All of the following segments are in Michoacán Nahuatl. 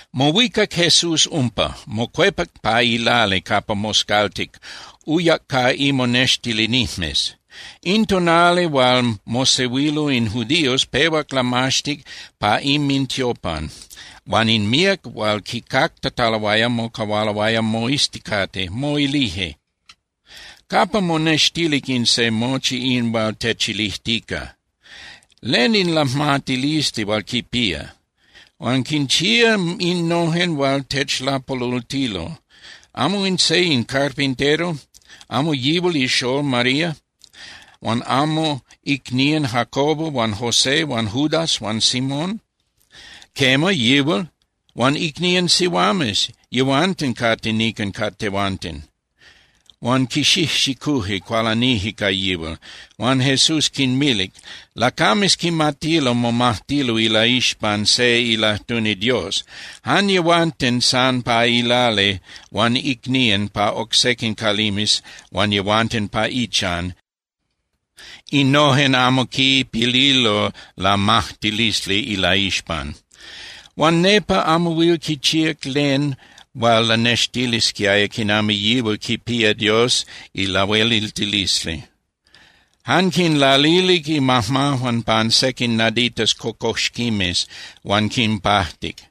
Mohuicac Jesús umpa, mocuepac pa ilali capa moscaltic, uyac ca imonextilinijmes. In tonali hual mosehuilo in judíos pehuac lamaxtic pa inmintiopan, huan in míac hual quicactataloaya mocahualoaya moizticate, moilije: —¿Capa monextilic in se mochi in hual techilijtica? ¿Len in lajmatilisli hual quipía? Huan quinchía innojen hual techlapolultilo. ¿Amo in se in carpintero, amo yihual ixól María, huan amo icnían Jacobo huan José huan Judas huan Simón? Quema, yihual. Huan icnían sihuames, yehuanten cate nican ca tehuanten. Huan quixijxicuje, cualanije ca yihual. Huan Jesús quinmilic: —Lacames quimatilo momajtilo ilaixpan se ilajtuni Dios. Jan yehuanten san pa ilali huan icnían pa oc sequin calimes huan yehuanten pa ichan, innojen amo quipililo lamajtilisli ilaixpan. Huan nepa amo huil quichíac len hual lanextilisquiaya quinami yihual quipía Dios ilahueliltilisli. Jan quinlalilic imajmajuan pan sequin naditas cocoxquimes huan quinpajtic.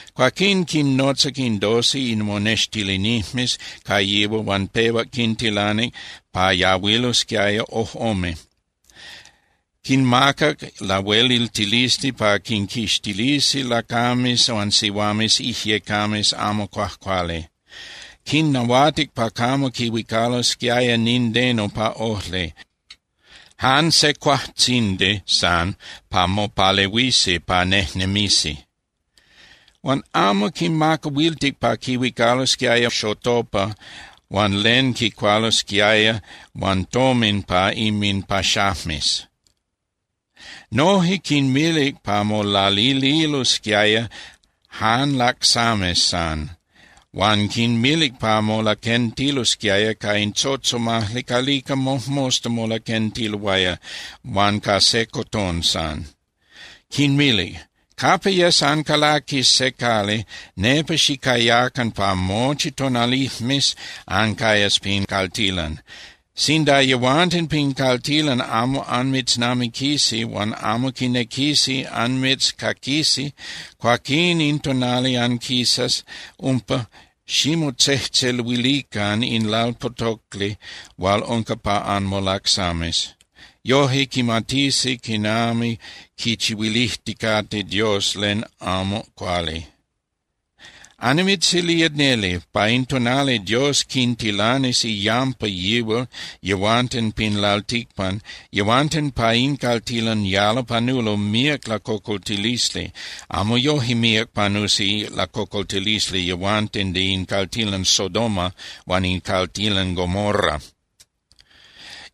Cuaquín quinnotzac in doce imonextilinijmes ca yihual huan pehuac quintilanic pa yahuilosquiaya ojꞌome. Quinmacac lahueliltilisli pa quinquixtilisi lacames huan sihuames ijyecames amo cuajcuali. Quinnahuatic pa camo quihuicalosquiaya nindeno pa ojli, jan se cuajtzindi san pa mopalehuisi pa nejnemisi. Huan amo quinmacahuiltic pa quihuicalosquiaya xotopa huan len quicualosquiaya huan tomin pa inminpaxajmes. Noje quinmilic pa molalililosquiaya jan lacsames san, huan quinmilic pa molaquentilosquiaya ca in tzotzomajli calica mojmosta molaquentiloaya huan ca se cotón san. Quinmilic: —Capa yes ancalaquis se cali, nepa xicayacan pa mochi tonalijmes ancayas pin caltilan. Sinda yehuanten pin caltilan amo anmitznamiquisi huan amo quinequisi anmitzcaquisi, cuaquín in tonali anquisas umpa, ximotzejtzeluilican in lalpotocli hual unca pa anmolacsames. Yoje quimatisi quinami quichihuilijticate Dios len amo cuali. Annimitzilía neli, pa in tonali Dios quintilanis iyampa yihual yehuanten pin lalticpan, yehuanten pa in caltilan yalo panulo míac lacocoltilisli. Amo yoje míac panusi lacocoltilisli yehuanten de in caltilan Sodoma huan in caltilan Gomorra.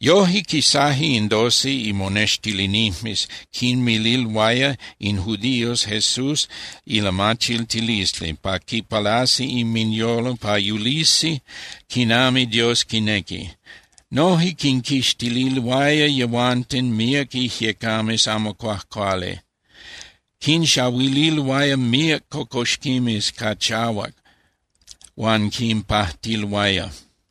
Yoje quisaje in doce imonextilinijmes quinmililoaya in judíos Jesús ilamachiltilisli pa quipalasi inminyolo pa yulisi quinami Dios quinequi. Noje quinquixtililoaya yehuanten míac ijyecames amo cuajcuali, quinxahuililoaya míac cocoxquimes ca chahuac huan quinpajtiloaya.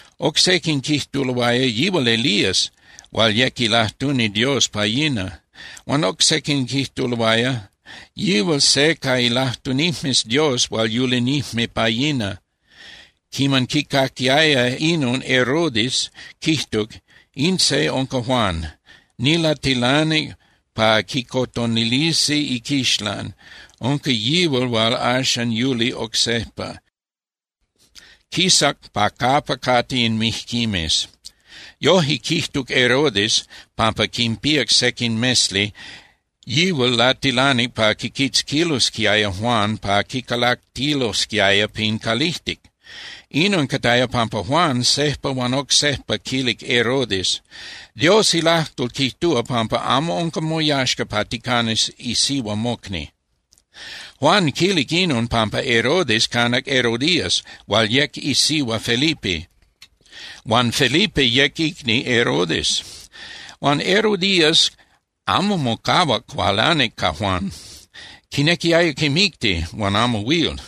Oc sequin quijtuloaya: —Yihual Elías, hual yec ilajtuni Dios pa yina. Huan oc sequin quijtuloaya: —Yihual se ca ilajtunijmes Dios hual yulinijme pa yina. Quiman quicaquiaya inon Herodes, quijtuc: —In se unca Juan. Nilatilanic pa quicotonilisi iquixlan. Unca yihual hual axan yuli oc sejpa, quisac pa capa cate in mijquimes. Yoje quijtuc Herodes pampa quinpíac sequin mesli, yihual latilanic pa quiquitzquilosquiaya Juan pa quicalactilosquiaya pin calijtic. Inon cataya pampa Juan sejpa huan oc sejpa quilic Herodes: —Dios ilajtol quijtúa pampa amo unca moyaxca pa ticanas isihua mocni. Juan quilic inon pampa Herodes canac Herodías hual yec isihua Felipe huan Felipe yec icni Herodes. Huan Herodías amo mocahuac cualanic ca Juan. Quinequiaya quimicti, huan amo huil.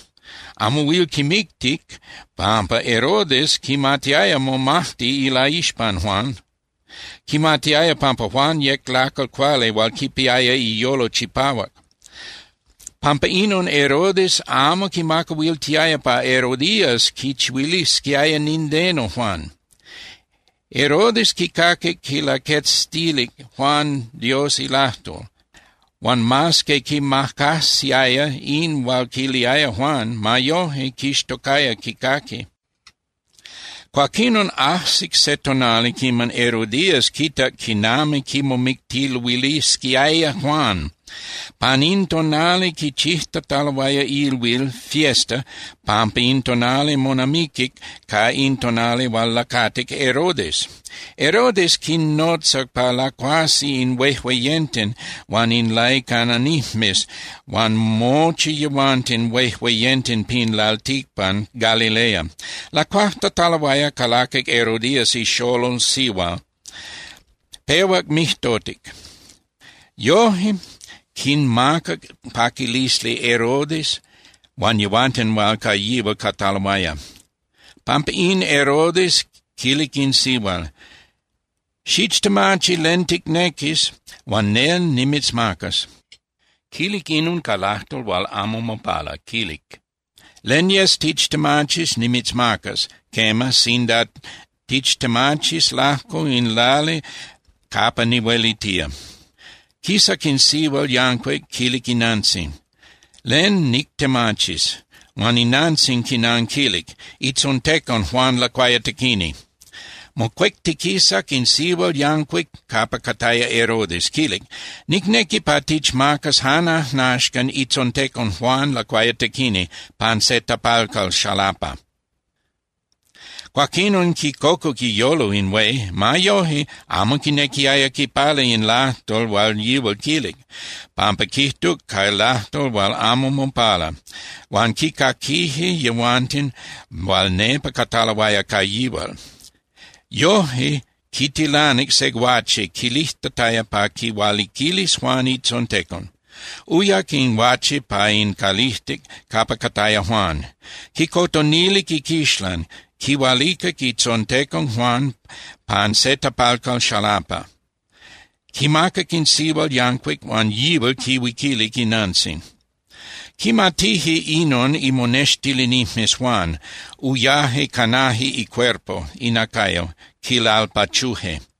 Amo huil quimictic pampa Herodes quimatiaya momajti ilaixpan Juan. Quimatiaya pampa Juan yec lacal cuali hual quipiaya iyolo chipahuac. Pampa inon Herodes amo quimacahuiltiaya pa Herodías quichihuilisquiaya nindeno Juan. Herodes quicaquic quilaquetzilic Juan Dios ilajtol, huan mas que quimacajsiaya in hual quiliaya Juan, ma yoje quixtocaya quicaqui. Cuaquinon, ajsic se tonali quiman Herodías quitac quinami quimomictiluilisquiaya Juan. Pan in tonali quichijtataloaya ilhuil (fiesta) pampa in tonali monamiquic ca in tonali hual lacatic Herodes. Herodes quinnotzac pa lacuasi in huejueyenten huan in laicananijmes huan mochi yehuanten huejueyenten pin lalticpan Galilea. Lacuajtataloaya, calaquic Herodías ixolol sihual, pehuac mijtotic. Yoje quinmacac paquilisli Herodes huan yehuanten hual ca yihual cataloaya. Pampa in, Herodes quilic in sihual: —Xichtemachi len ticnequis huan nel nimitzmacas. Quilic inon ca lajtol hual amo mopala, quilic: —Len yes tichtemachis nimitzmacas, quema, sinda tichtemachis lajco in lali capa nihuelitía. Quisac in sihual yancuic, quilic inantzin: —¿Len nictemachis? Huan inantzin quinanquilic: —Itzontecon Juan Lacuayatequini. Mocuectiquisac in sihual yancuic capa cataya Herodes, quilic: —Nicnequi pa tichmacas jan ajnaxcan itzontecon Juan Lacuayatequini pan se tapalcal xalapa. Cuaquinon quicocuc iyolo in hué. Ma yoje, amo quinequiaya quipala in lajtol hual yihual quilic, pampa quijtuc ca lajtol hual amo mopala, huan quicaquije yehuanten hual nepa cataloaya ca yihual. Yoje, quitilanic se guache quilijtataya pa quihualiquilis Juan itzontecon. Uyac in guache pa in calijtic capa cataya Juan, quicotonilic iquixlan, quihualicac itzontecon Juan pan se tapalcal xalapa. Quimacac in sihual yancuic, huan yihual quihuiquilic inantzin. Quimatije inon imonextilinijmes Juan, uyaje canaje icuerpo (inacayo), quilalpachuje.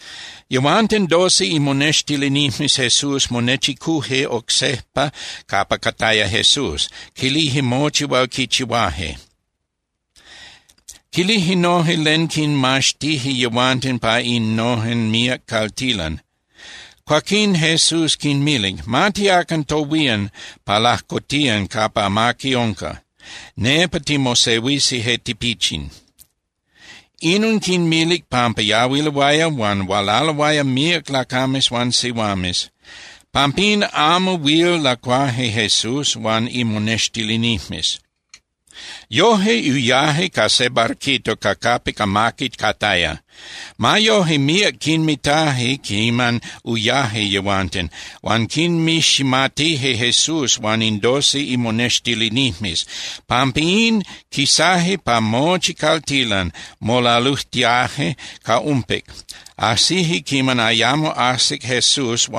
Yehuanten doce imonextilinijmes Jesús monechicuje oc sejpa capa cataya Jesús, quilije mochi hual quichihuaje. Quilije noje len quinmaxtije yehuanten pa innojen míac caltilan. Cuaquín Jesús quinmilic: —Ma tiacan tohuían pa lajcotiyan capa amaqui unca, nepa timosehuisi je tipichin. Inon quinmilic pampa yahuiloaya huan hualaloaya míac lacames huan sihuames. Pampín amo huil lacuaje Jesús huan imonextilinijmes. Yoje uyaje ca se barquito ca capic amaqui cataya. Ma yoje, míac quinmitaje quiman uyaje yehuanten, huan quinmiximatije Jesús huan in doce imonextilinijmes. Pampín quisaje pa mochi caltilan, molalujtiaje ca umpic, ajsije quiman ayamo ajsic Jesús.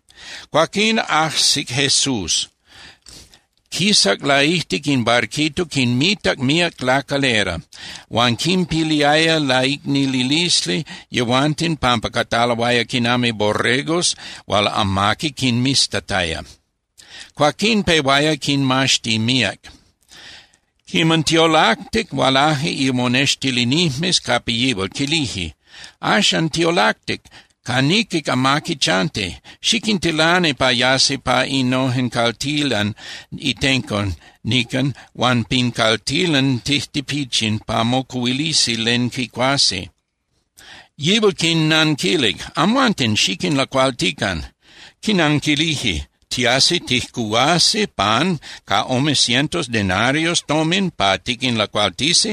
Cuaquinon, ajsic Jesús, quisac laijtic in barquito, quinmitac míac lacalera. Huan quinpiliaya laicnililisli yehuanten pampa cataloaya quinami borregos hual amaqui quinmiztataya. Cuaquín pehuaya quinmaxti míac. Quiman tiolactic, hualaje imonextilinijmes capa yihual, quilije: —Axan tiolactic, ca niquic amaqui chanti. Xiquintilani pa yasi pa innojen caltilan itenco nican huan pin caltilan tijtipichin pa mocuhuilisi len quicuasi. Yihual quinnanquilic: —Amhuanten xiquinlacualtican. Quinanquilije: —¿Tiasi tijcuhuasi pan ca ome cientos denarios tomin pa tiquinlacualtisi?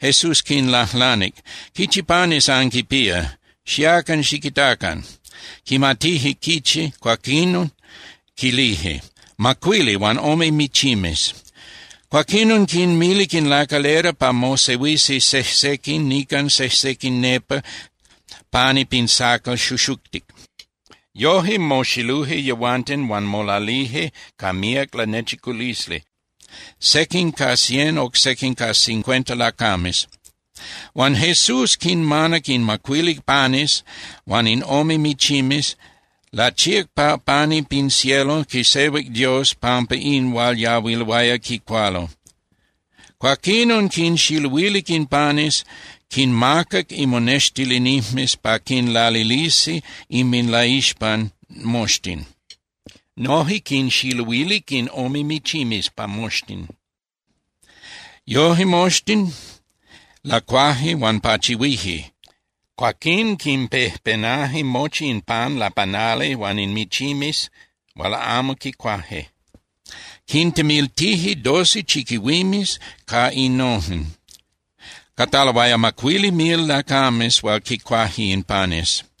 Jesús quinlajlanic: —¿Quichi panes anquinpía? Xiacan xiquitacan. Quimatije quichi, cuaquín quilije: —Macuili, huan ome michimes. Cuaquinon quinmilic in lacalera pa mosehuisi sejsequin nican, sejsequin nepa pani pin sacal xuxuctic. Yoje moxiluje yehuanten huan molalije ca míac lanechiculisli, sequin ca cien, oc sequin ca cincuenta lacames. Huan Jesús quinmanac in macuili panes huan in ome michimes, lachíac pa pani pin cielo, quisehuic Dios pampa in hual yahuiloaya quicualo. Cuaquinon quinxiluilic in panes, quinmacac imonextilinijmes pa quinlalilisi inminlaixpan moxtin. Noje quinxiluilic in ome michimes pa moxtin. Yoje moxtin lacuaje huan pachihuije. Cuaquín quinpejpenaje mochi in pan lapanali huan in michimes hual amo quicuaje, quintemiltije doce chiquihuimes ca innojen. Cataloaya macuili mil lacames hual quicuaje in panes.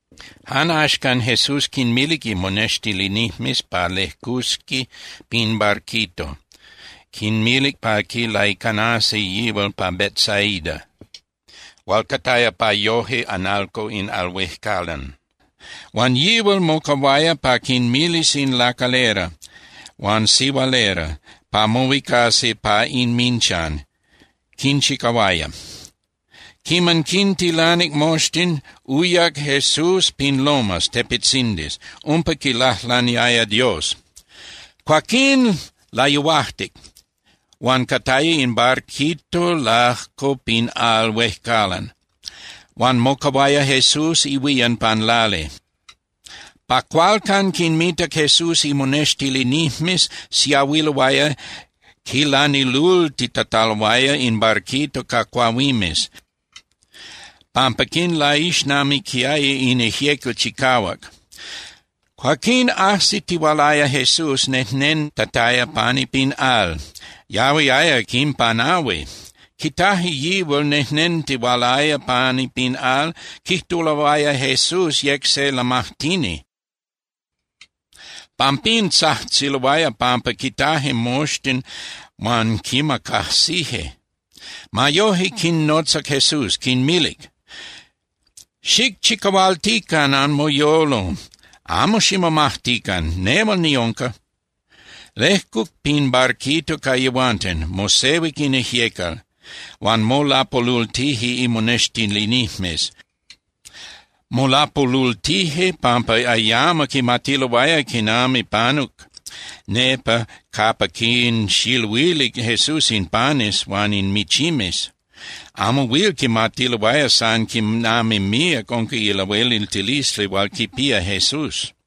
Jan axcan Jesús quinmilic imonextilinijmes pa lejcusi pin barquito, quinmilic pa quilaicanasi yihual pa Betsaida hual cataya pa yoje (analco) in al huejcalan. Huan yihual mocahuaya pa quinmilis in lacalera huan sihualera pa mohuicasi pa inminchan, quinchicahuaya. Quiman quintilanic moxtin, uyac Jesús pin lomas (tepetzindis), umpa quilajlaniaya Dios. Cuaquín layuajtic, huan cataya in barquito lajco pin al huejcalan huan mocahuaya Jesús ihuían pan lali. Pa cualcan quinmitac Jesús imonextilinijmes siahuiloaya quilanilultitataloaya in barquito ca cuahuimes, pampa quinlaixnamiquiaya in ijyecal chicahuac. Cuaquín ajsitihualaya Jesús nejnentataya pani pin al, yahuiaya quinpanahui. Quitaje yihual nejnentihualaya pani pin al, quijtuloaya Jesús yec se lamajtini. Pampín tzajtziloaya pampa quitaje moxtin huan quimacajsije. Ma yoje, quinnotzac Jesús, quinmilic: —¡Xicchicahualtican anmoyolo, amo ximomajtican! ¡Nehual niunca! Lejcuc pin barquito ca yehuanten, mosehuic in ijyecal. Huan molapolultije imonextilinijmes. Molapolultije pampa ayamo quimatiloaya quinami panuc nepa capa quinxiluilic Jesús in panes huan in michimes. Amo huil quimatiloaya san quinami míac unca ilahueliltilisli hual quipía Jesús.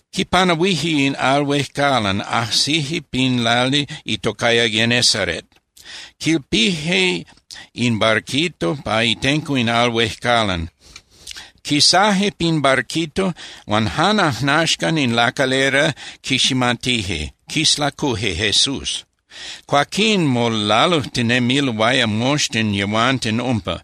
Quipanahuije in al huejcalan, ajsije pin lali itocaya Genesaret. Quilpije in barquito pa itenco in al huejcalan. Quisaje pin barquito huan jan ajnaxcan in lacalera quiximatije, quislacuje Jesús. Cuaquín molalujtinemiloaya moxtin yehuanten umpa,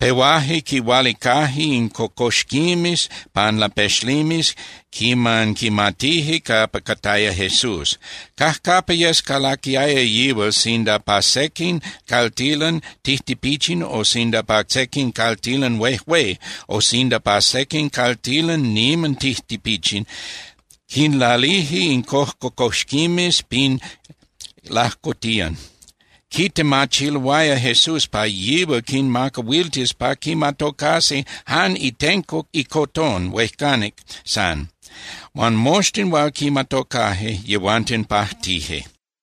pehuaje quihualicaje in cocoxquimes pan lapexlimes quiman quimatije capa cataya Jesús. Cajcapa yes calaquiaya yihual, sinda pa sequin caltilan tijtipichin o sinda pa sequin caltilan huejué o sinda pa sequin caltilan niman tijtipichin, quinlalije in cojcocoxquimes pin lajcotiyan. Quitemachiloaya Jesús pa yihual quinmacahuiltis pa quimatocasi jan itenco icotón huejcanic san. Huan moxtin hual quimatocaje, yehuanten pajtije.